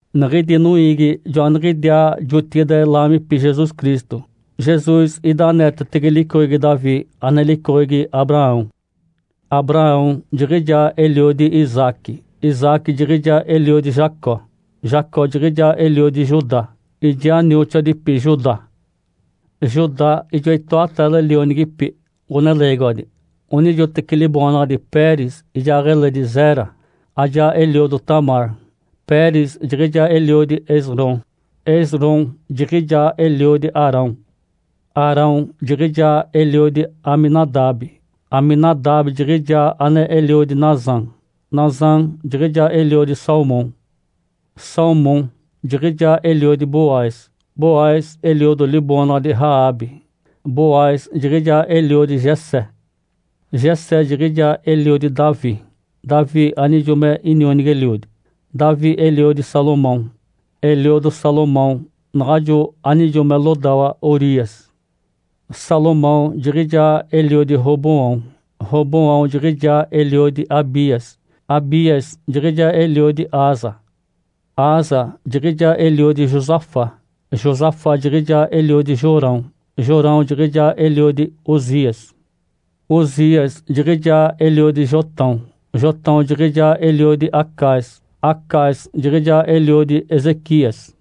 Niɡ̶idi noiigi joaniɡ̶idiaa jotigide laamipi Jesus Cristo. Jesus ida aneetetege licoɡ̶egi Davi, ane licoɡ̶egi Abraão. Abraão jiɡ̶ijaa eliodi Isaque, Isaque jiɡ̶ijaa eliodi Jacó. Jacó jiɡ̶ijaa eliodi Judá ijaa nioxoadipi Judá. Judá ijoa itoataale lionigipi ɡ̶oneleegiwadi, onijoteci liboonaɡ̶adi Peres ijaaɡ̶eledi Zera, ajaa eliodo Tamar. Peres jiɡ̶ijaa eliodi Esrom, Esrom jiɡ̶ijaa eliodi Arão. Arão jiɡ̶ijaa eliodi Aminadabe, Aminadabe jiɡ̶ijaa ane eliodi Nasam. Nasam jiɡ̶ijaa eliodi Salmom. Salmom jiɡ̶ijaa eliodi Boaz, Boaz eliodo liboonaɡ̶adi Raabe. Boaz jiɡ̶ijaa eliodi Jessé. Jessé jiɡ̶ijaa eliodi Davi, Davi anijo me inionigi-eliodi. Davi eliodi Salomão, eliodo Salomão naɡ̶ajo anijo me lodawa Urias. Salomão jiɡ̶ijaa eliodi Roboão, Roboão jiɡ̶ijaa eliodi Abias, Abias jiɡ̶ijaa eliodi Asa. Asa jiɡ̶ijaa eliodi Josafá, Josafá jiɡ̶ijaa eliodi Jorão, Jorão jiɡ̶ijaa eliodi Uzias. Uzias jiɡ̶ijaa eliodi Jotão, Jotão jiɡ̶ijaa eliodi Acaz, Acaz jiɡ̶ijaa eliodi Ezequias.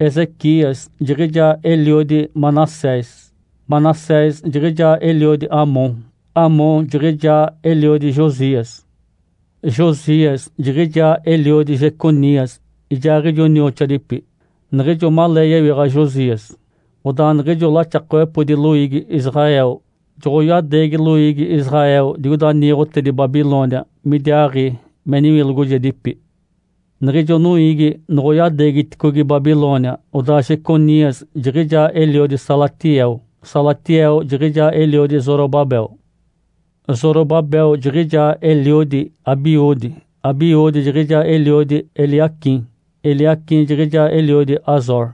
Ezequias jiɡ̶ijaa eliodi Manassés, Manassés jiɡ̶ijaa eliodi Amom, Amom jiɡ̶ijaa eliodi Josias. Josias jiɡ̶ijaa eliodi Jeconias ijaaɡ̶ijo nioxoadipi. Niɡ̶ijo malee yewiɡ̶a Josias, odaa niɡ̶ijo laxakawepodi loiigi Israel joɡ̶oyadeegi loiigi Israel digoida niiɡ̶otedi Babilônia midiaaɡ̶i me niwilogojedipi. Niɡ̶ijo noiigi noɡ̶oyadeegiticogi Babilônia, odaa Jeconias jiɡ̶ijaa eliodi Salatiel, Salatiel jiɡ̶ijaa eliodi Zorobabel. Zorobabel jiɡ̶ijaa eliodi Abiúde, Abiúde jiɡ̶ijaa eliodi Eliaquim, Eliaquim jiɡ̶ijaa eliodi Azor.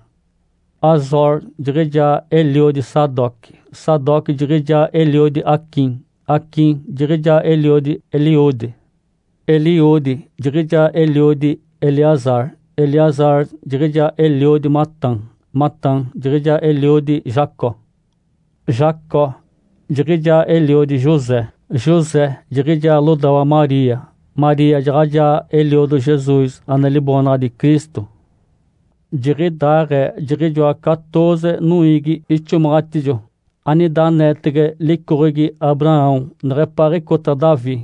Azor jiɡ̶ijaa eliodi Sadoque, Sadoque jiɡ̶ijaa eliodi Aquim, Aquim jiɡ̶ijaa eliodi Eliúde. Eliúde jiɡ̶ijaa eliodi Eleazar, Eleazar jiɡ̶ijaa eliodi Matã, Matã jiɡ̶ijaa eliodi Jacó. Jacó jiɡ̶ijaa eliodi José, José jiɡ̶ijaa lodawa Maria. Maria jaɡ̶ajaa eliodo Jesus, ane liboonaɡ̶adi Cristo. Jiɡ̶idaaɡ̶ee jiɡ̶ijoa catooze noiigi ixomaɡ̶atijo anida aneetege licoɡ̶egi Abraão neɡ̶epaaɡ̶icota Davi,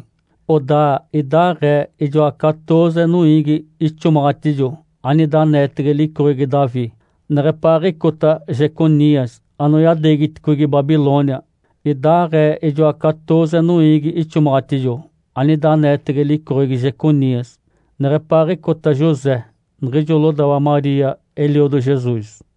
odaa idaaɡ̶ee ijoa catooze noiigi ixomaɡ̶atijo anida aneetege licoɡ̶egi Davi neɡ̶epaaɡ̶icota Jeconias anoyadeegiticogi Babilônia. Idaaɡ̶ee ijoa catooze noiigi ixomaɡ̶atijo anida aneetege licoɡ̶egi Jeconias neɡ̶epaaɡ̶icota José, niɡ̶ijo lodawa Maria eliodo Jesus.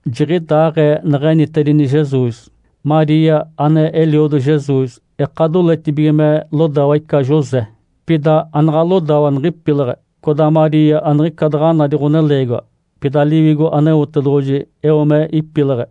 Jiɡ̶idaaɡ̶ee neɡ̶enitedini Jesus. Maria, ane eliodo Jesus, eka doletibige me lodawa ica José. Pida anaɡ̶a lodawa niɡ̶ipileɡ̶e, codaa Maria aniɡ̶ica daɡ̶a nadi ɡ̶oneleegiwa. Pida Liwigo Aneotedoɡ̶oji eo me ipileɡ̶e.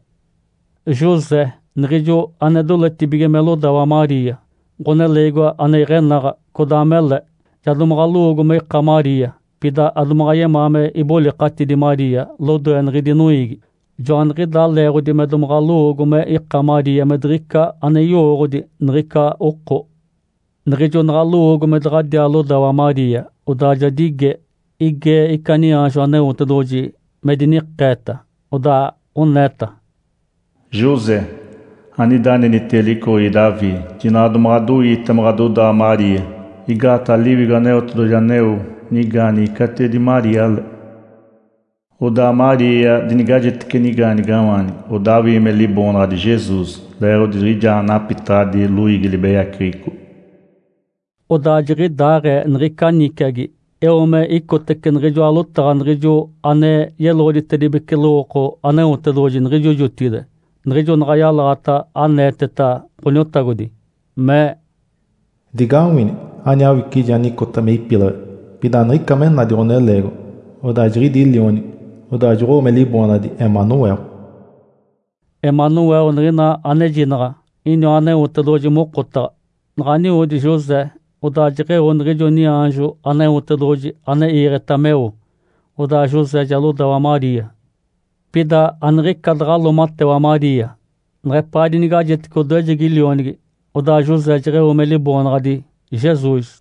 José, niɡ̶ijo ane doletibige me lodawa Maria, ɡ̶oneleegiwa ane iɡ̶enaɡ̶a, codaa mele. Ja domaɡ̶a lowoogo me ika Maria, pida adomaɡ̶a yemaa me ibolikatidi Maria lodoe niɡ̶idi noiigi. Joaniɡ̶idaa leeɡ̶odi me domaɡ̶a lowoogo me ika Maria me diɡ̶ica ane yowooɡ̶odi niɡ̶ica oko. Niɡ̶ijo naɡ̶a lowoogo me daɡ̶adiaa lodawa Maria, odaa ja dige. Igee ica niaanjo Aneotedoɡ̶oji me dinikeeta. Odaa oneeta, “José, anida anenitege licoɡ̶egi Davi, jinaɡ̶a domaɡ̶a adoiita me ɡ̶adodawa Maria. Igaataɡ̶a Liwigo Aneotedoɡ̶oji aneo nigaanigi catiwedi Maria le. Odaa Maria dinigajetece nigaanigawaanigi, odaa awii me liboonaɡ̶adi Jesus, leeɡ̶odi jiɡ̶ijaa napitaɡ̶adi loiigi libeyaceɡ̶eco.” Odaa jiɡ̶idaaɡ̶ee niɡ̶ica niciagi eo me icotece niɡ̶ijoa lotaɡ̶a niɡ̶ijo ane yeloɡ̶oditedibece lowooko Aneotedoɡ̶oji niɡ̶ijo jotigide, niɡ̶ijo naɡ̶a yalaɡ̶ata aneeteta Ǥoniotagodi, mee, “Digawini! Ani awicije anicota me ipileɡ̶e, pida aniɡ̶ica me nadi ɡ̶oneleegiwa. Odaa jiɡ̶idi lionigi, odaa joɡ̶owo me liboonaɡ̶adi ‘Emanuel’.” “Emanuel” niɡ̶ina anejinaɡ̶a iniwa “Aneotedoɡ̶oji mokotaɡ̶a”. Naɡ̶a nioodi José, odaa jeɡ̶eo niɡ̶ijo niaanjo Aneotedoɡ̶oji ane iiɡ̶eta meo. Odaa José ja lodawa Maria. Pida aniɡ̶ica daɡ̶a loomatewa Maria neɡ̶epaa dinigajetece odoejegi lionigi. Odaa José jeɡ̶eo me liboonaɡ̶adi Jesus.